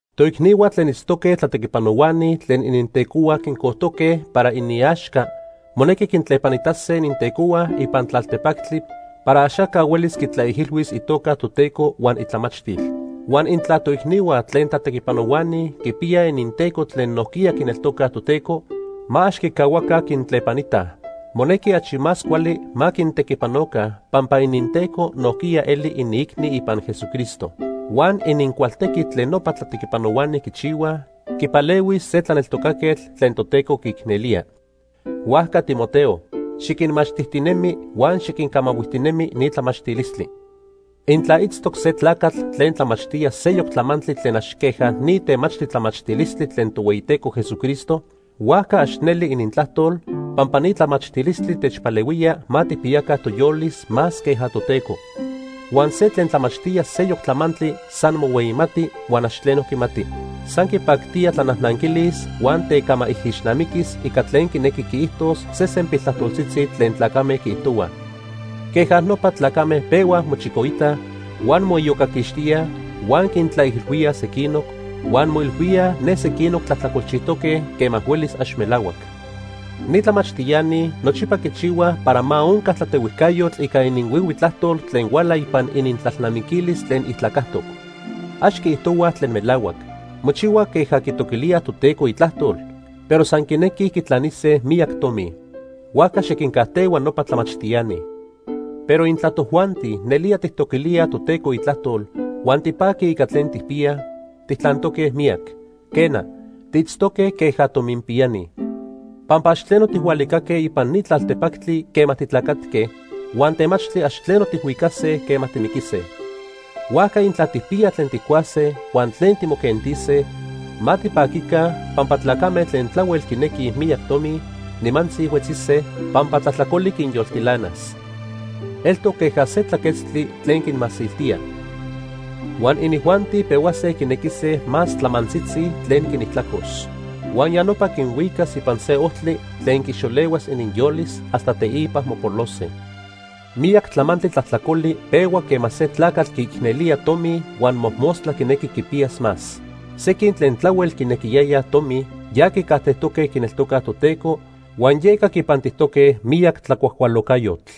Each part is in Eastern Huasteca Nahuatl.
Toicnihua tlen itztoque tlatequipanohuani tlen inintecohua quincojtoque para iniaxca monequi quintlepanitase inintecohua ipan tlaltepactli para axaca huelis quitlaijilhuis itoca Toteco huan itlamachtil. Huan intla toicnihua tlen tlatequipanohuani quipiyaj ininteco tlen nojquiya quineltocaj Toteco, ma ax quicahuaca quintlepanitaj. Monequi achi más cuali ma quintequipanoca pampa ininteco nojquiya eli iniicni ipan Jesucristo. Huan inincualtequi tlen nopa tlatequipanohuani quichihuaj quipalehuis se tlaneltocaquetl tlen Toteco quiicnelía. Huajca Timoteo, xiquinmachtijtinemi huan xiquincamahuijtinemi ni tlamachtilistli. Intla itztoc se tlacatl tlen tlamachtía seyoc tlamantli tlen ax queja ni temachtli tlamachtilistli tlen Tohueyiteco Jesucristo, huajca ax neli inintlajtol, pampa ni tlamachtilistli techpalehuía ma tijpiyaca toyolis más queja Toteco. Huan se tlen tlamachtía seyoc tlamantli san mohueyimati huan ax tleno quimati. San quipactía tlanajnanquilis huan tecamaijixnamiquis ica tlen quinequi quiijtos sesen piltlajtoltzitzi tlen tlacame quiijtohuaj. Queja nopa tlacame pehuaj mochicoitaj, huan moiyocaquixtíaj, huan quintlaijilhuíaj sequinoc, huan moilhuíaj ne sequinoc tlajtlacolchijtoque quema huelis ax melahuac. Ni tlamachtiani nochipa quichihuaj para ma onca tlatehuijcayotl ica ininhuihui tlajtol tlen huala ipan inintlalnamiquilis tlen ijtlacajtoc. Ax quiijtohuaj tlen melahuac. Mochihuaj queja quitoquilíaj Toteco itlajtol, pero san quinequij quitlanise miyac tomi. Huajca xiquincajtehua nopa tlamachtiani. Pero intla tojuanti nelía tijtoquilíaj Toteco itlajtol huan tipaquij ica tlen tijpiyaj, tijtlantoque miyac. Quena, tiitztoque queja tominpiyani. Pampa ax tleno tijhualicaque ipan ni tlaltepactli quema titlacatque huan temachtli ax tleno tijhuicase quema timiquise. Huajca intla tijpiyaj tlen tijcuase huan tlen timoquentise, ma tipaquica, pampa tlacame tlen tlahuel quinequij miyac tomi, nimantzi huetzise, pampa tlajtlacoli quinyoltilanas. Eltoc queja se tlaquetztli tlen quinmasiltía. Huan inijuanti pehuase quinequise más tlamantzitzi tlen quinijtlacos. Huan ya nopa quinhuicas ipan se ojtli tlen quixolehuas ininyolis hasta teipa mopolose. Miyac tlamantli tlajtlacoli pehua quema se tlacatl quiicnelía tomi huan mojmostla quinequi quipiyas más. Sequin tlen tlahuel quinequiyayaj tomi ya quicajtejtoque quineltocaj Toteco huan yeca quipantijtoque miyac tlacuajcualocayotl.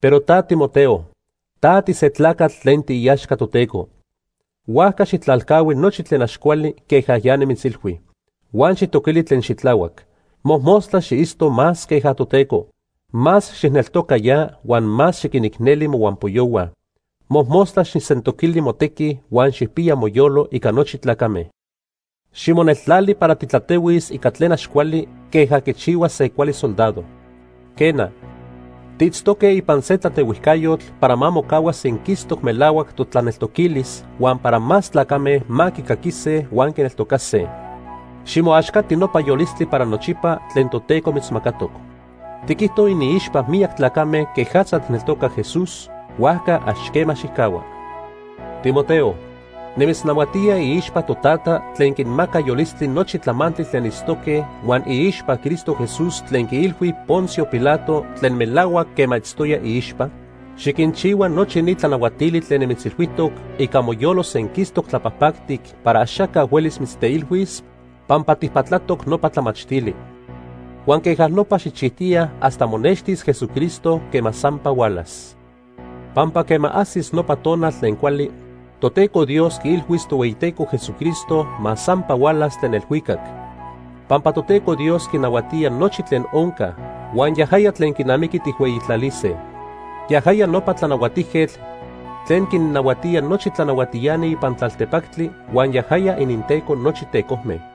Pero ta Timoteo, ta tise tlacatl tlen tiiaxca Toteco. Huajca xijtlalcahui nochi tlen ax cuali queja ya nimitzilhui. Huan xijtoquili tlen xitlahuac. Mojmostla xiitzto más queja Toteco. Más xijneltoca ya huan más xiquinicneli mohuampoyohua. Mojmostla xijsentoquili motequi huan xijpiya moyolo ica nochi tlacame. Ximoneltlali para titlatehuis ica tlen ax cuali queja quichihua se cuali soldado. Quena, tiitztoque ipan se tlatehuijcayotl para ma mocahua senquistoc melahuac totlaneltoquilis huan para más tlacame ma quicaquise huan quineltocase. Ximoaxcati nopa yolistli para nochipa tlen Toteco mitzmacatoc. Tiquijto iniixpa miyac tlacame quejatza tijneltoca Jesús; huajca ax quema xijcahua. Timoteo, nimitznahuatía iixpa Totata tlen quinmaca yolistli nochi tlamantli tlen itztoque huan iixpa Cristo Jesús tlen quiilhui Poncio Pilato tlen melahuac quema itztoya iixpa, xiquinchihua nochi ni tlanahuatili tlen nimitzilhuijtoc ica moyolo senquistoc tlapajpactic para axaca huelis mitzteilhuis pampa tijpatlatoc nopa tlamachtili. Huan queja nopa xijchijtiya hasta monextis Jesucristo quema sampa hualas. Pampa quema ajsis nopa tonal tlen cuali, Toteco Dios quiilhuis Tohueyiteco Jesucristo ma sampa hualas tlen elhuicac. Pampa Toteco Dios quinahuatía nochi tlen onca huan yajaya tlen quinamiqui tijhueyitlalise. Yajaya nopa Tlanahuatijquetl tlen quinnahuatía nochi tlanahuatiani ipan tlaltepactli huan yajaya ininTeco nochi tecojme.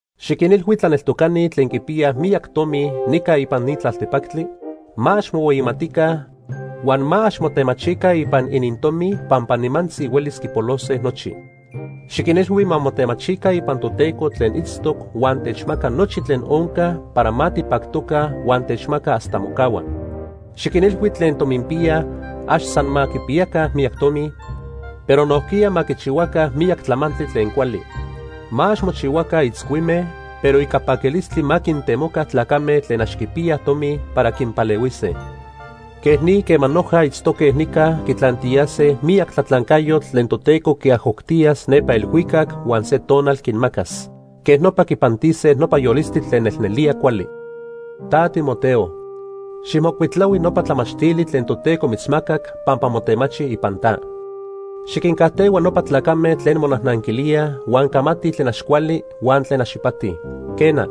Xiquinilhui tlaneltocani tlen quipiyaj miyac tomi nica ipan ni tlaltepactli, ma ax mohueyimatica huan ma ax motemachica ipan inintomi pampa nimantzi huelis quipolose nochi. Xiquinilhui ma motemachica ipan Toteco tlen itztoc huan techmaca nochi tlen onca para ma tipactoca huan techmaca hasta mocahua. Xiquinilhui tlen tominpiyaj ax san ma quipiyaca miyac tomi, pero nojquiya ma quichihuaca miyac tlamantli tlen cuali. Ma ax mochihuaca itzcuime, pero ica paquilistli ma quintemoca tlacame tlen ax quipiyaj tomi para quinpalehuise. Quej ni quema noja itztoque nica quitlantiyase miyac tlatlancayotl tlen Toteco quiajoctiyas nepa elhuicac huan se tonal quinmacas. Queja nopa quipantise nopa yolistli tlen nelnelía cuali. Ta Timoteo, xijmocuitlahui nopa tlamachtili tlen Toteco mitzmacac pampa motemachi ipan ta. Xiquincajtehua nopa tlacame tlen monajnanquilíaj huan camatij tlen ax cuali huan tlen ax ipati. Quena,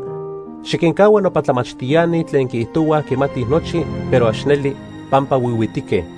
xiquincahua nopa tlamachtiani tlen quiijtohuaj quimatij nochi, pero ax neli, pampa huihuitique.